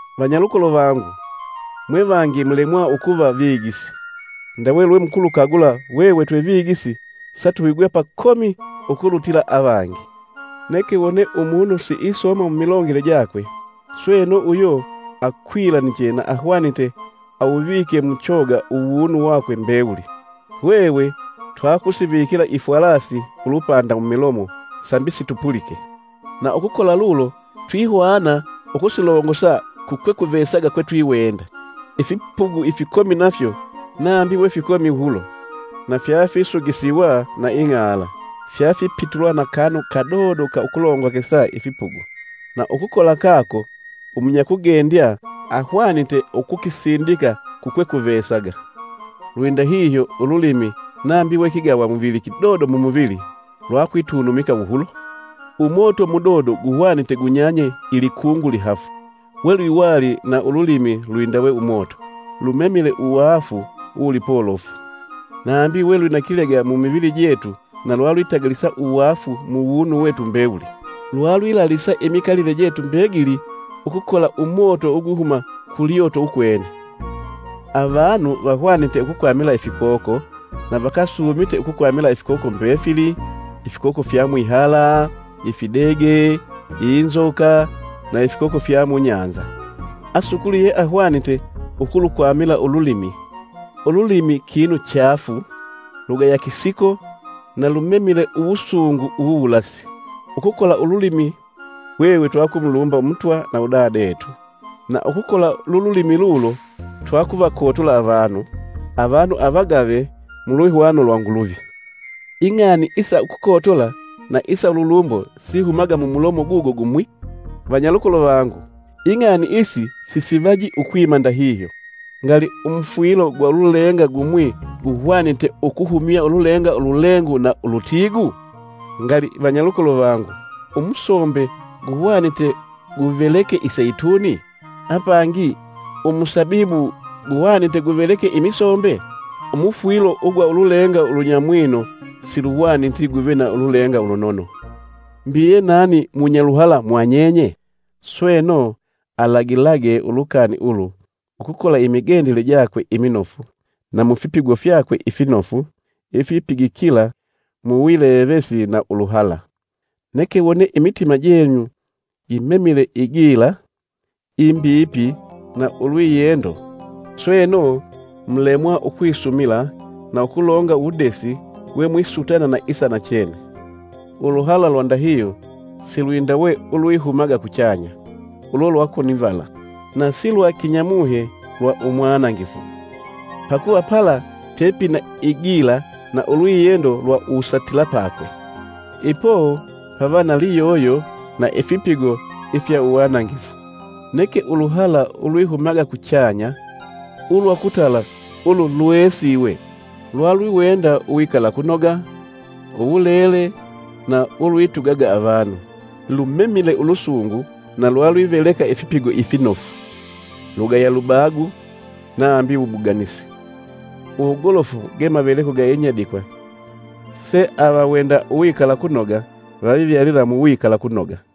Vanyalukolo vangu, mwevangi mulemwa ukuva vigisi. Ndawe lwemukulukagula, hwehwe twe vigisi satuhigwa pakomi ukulutila avangi. Neke wone umunu siisooma mumilongele jakwe, sweno, uyo akwilaniche, na ahwanite awuvike muchoga uwunu wakwe mbewuli. Hwehwe twakusivikila ifwalasi ulupanda mumilomo sambi situpulike, na ukukola lulo twihwana ukusilongosa kukwekuvesaga kwetwiwenda. Ifipugu ifikomi nafyo, nambi we fikomi wuhulo, na fyafisugisiwa na ing'ala, fyafipitulwa na kanu kadodo ka ukulongokesa ifipugu, na ukukola kako umunyakugendya ahwanite ukukisindika kukwekuvesaga. Lwindahihyo, ululimi nambi we kigawamuvili kidodo mumuvili, lwakwitunumika wuhulo. Umoto mudodo guhwanite gunyanye ilikungu lihafu. Welwiwali na ululimi lwindawe umoto. Lumemile uwaafu uwulipolofu, nambi we lwina kilega mumivili jetu na lwalwitagalisa uwaafu muwunu wetu mbewuli. Lwalwilalisa imikalile jetu mbegili ukukola umoto ugwihuma ku Lyoto ukwene. Avanu vahwanite ukukwamila ifikoko, na vakasuumite ukukwamila ifikoko mbefili, ifikoko fya mwihala, ifidege, inzoka na ifikoko fya mubahali. Asukuli yeahwanite ukulukwamila ululimi. Ululimi kinu chaafu, lugaya kisiko, na lumemile uwusungu uwuwulasi. Ukukola ululimi hwehwe twakumulumba Umutwa na Udadetu. Na ukukola lululimi lulo twakuvakotola avanu, avanu avagave mulwihwano lwa Nguluvi. Ing'ani isa ukukotola na isa ululumbo sihumaga mu mulomo gugo gumwi. Vanyalukolo vangu, ing'ani isi sisivaji ukwima ndahihyo. Ngali, umufwilo gwa ululenga gumwi guhwanite ukuhumya ululenga ululengu na ulutiigu? Ngali vanyalukolo vangu umusombe guhwanite guveleke iseituni? Apangi, Umusabibu guhwanite guveleke imisombe? Umufwilo ugwa ululenga ulunyamwino siluhwaniti guve na ululenga ulunono. Mbi, ye nani munyaluhala mwanyenye? Sweno, alagilage ulukani ulu ukukola imigendele jakwe iminofu na mufipigo fyakwe ifinofu ifipigikila muwilevesi na uluhala. Neke wone imitima jenyu gimemile igila, imbipi na ulwiyendo, sweno, mulemwa ukwisumila na ukulonga uwudesi we mwisutana na isa nachene, uluhala lwandahihyo silwindawe ulwihumaga kuchanya, ulo lwa konivala, na si lwa kinyamuhe na umwanangifu. Pakuva pala pepina igila na ulwiyendo lwa uwusatilapakwe, ipo pava na liyoyo na ifipigo ifya uwanangifu. Neke uluhala ulwihumaga kuchanya, ulwa ukutala ulu lweesiwe, lwalwiwenda uwikalakunoga, uwulele na ulwitugaga avanu, lumemile ulusungu na lwalwiveleka ifipigo ifinofu, lugaya lubagu nambi wubuganisi. Uwugolofu ge maveleko ga inyadikwa se avawenda uwikalakunoga vavivyalila mu wikalakunoga.